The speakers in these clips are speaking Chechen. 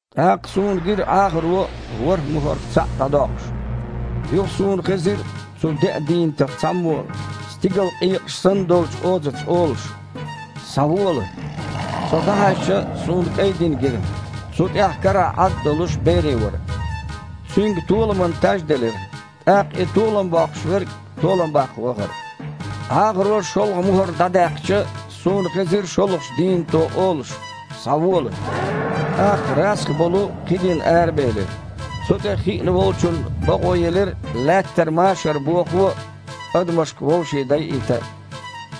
ТІаккха суна гира Іахаро ворхІ мухІарх цхьаъ дІадоккхуш. Юха суна хезира цу деа дийнатах цхьаммо стигала къекъаш санна долчу озаца олуш: «Схьавола!» Со дІахьаьжча, суна кІайн дин гира. Цу тІехь, карахь Іад а долуш, бере вара. Цуьнга толаман таж делира. ТІаккха и толам боккхуш верг толам баккха вахара. Іахаро шолгІа мухІар дІадаьккхича, суна хезира шолгІачу дийнато олуш: «Схьавола!» ТІаккха расха болу кхин дин арабелира. Цу тІе хиъна волчунна бакъо елира Лаьттара машар бохо а, адамашка вовшийн дайийта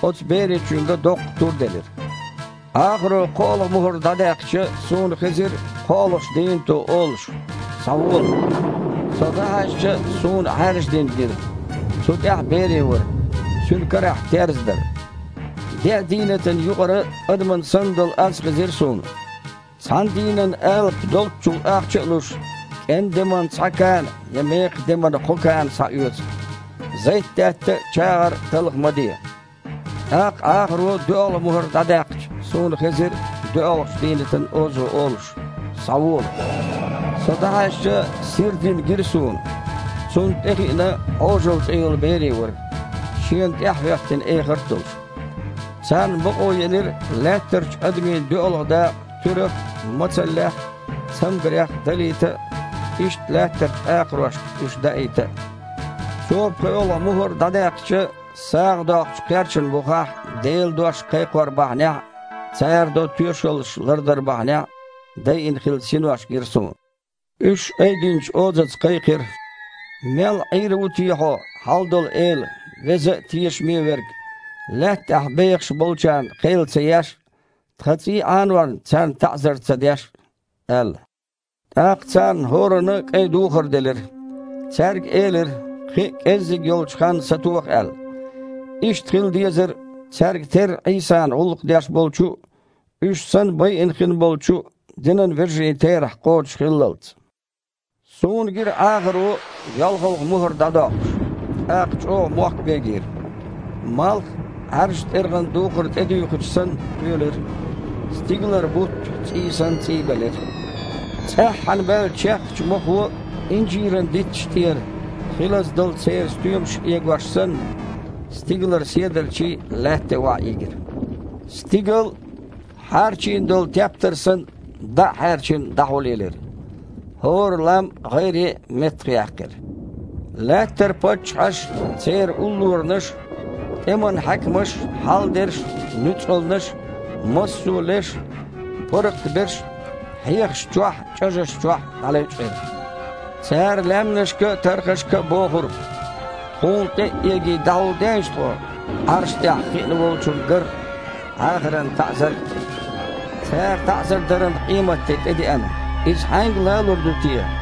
а. Оцу беречуьнга доккха тур делира. Іахаро кхоалгІа мухІар дІадаьккхича, суна хезира кхоалгІачу дийнато олуш: «Схьавола!» Со дІахьаьжча, суна Іаьржа дин гира. Цу тІехь бере вара, цуьнан карахь терза дара. Деа дийнатана юкъара адаман санна долу аз хезира суна: «Цхьана дийнан алапа долччул ахча а луш, кІен деман цхьа кана я мекхан деман кхо кана схьаоьцу. Зайтдаьтта а, чагІар а талха ма де!» ТІаккха Іахаро доьалгІа мухІар дІадаьккхича, суна хезира доьалгІачу дийнатан озо олуш: «Схьавола!» Со дІахьаьжча, сира дин гира суна. Цунна тІехиъна «Іожалла» цІе йолу бере вара, шена тІаьхьахІоьттина эхарт а долуш. Царна бакъо елира Лаьттарчу адамийн доьалгІа дакъа туьрах а, мацаллех а, цамгарех а далийта а, иштта Лаьттарчу акхарошка уьш даийта а. Цо пхоьалгІа мухІар дІадаьккхича, сагІа доккхучу кхерчана бухахь Делан дош кхайкхор бахьанехь а, цара до тоьшаллаш лардар бахьанехь а дайина хилла синош гира суна. Уьш айдинчу озаца кхайкхира: «Мел Іийр ву те Хьо, Хьалдолу Эла, веза а, тешаме а Верг, Лаьттахь бехаш болчарна кхел ца еш а, тхан цІий Іанорна царна таІзар ца деш а?» – аьлла. ТІаккха царна хІоранна а кІайн духар делира. Цаьрга элира, кхин а кІеззиг йолчу ханна сатоха аьлла. Иштта хила дезара, цаьрга терра Іийсана гІуллакх деш болчу а, уьш санна байина хин болчу а, динан вежарийн терахь кхочушхиллалц. Суна гира Іахаро йолхалгІа мухІар дІадоккхуш. ТІаккха чІогІа мохк бегийра. Малх а, Іаьржачу тІергІан духар тІедуьйхича санна, кхоьлира. Стигалара бутт а, цІий санна, цІийбелира. ЦІеххьана баьллачу чехкачу мохо инжиран дитташна тІера хилаза долу церан стоьмаш эгош санна, стигалара седарчий а Лаьтта тІе охьаийгира. Стигал а, хьарчийна долу тептар санна, дІа а хьаьрчина, дІахьулъелира. ХІора лам а, гІайре а меттахъяьккхира. Лаьттара паччахьаш а, церан уллоранаш а, тІеман хьаькамаш а, хьалдерш а, нуьцкъалнаш а, массо леш а, паргІат берш а хьехашна чохь а, чІажашна чохь а дІалевчкъира. Цара лаьмнашка а, тархашка а бохура: «Тхуна тІе а эгий, дІахьулдейша тхо Іарша тІехь хиъна Волчунна гарх а, Іахаран таІзарх а. Цара таІзар даран къематде тІедеана. Иза хьаьнга лалур ду те?»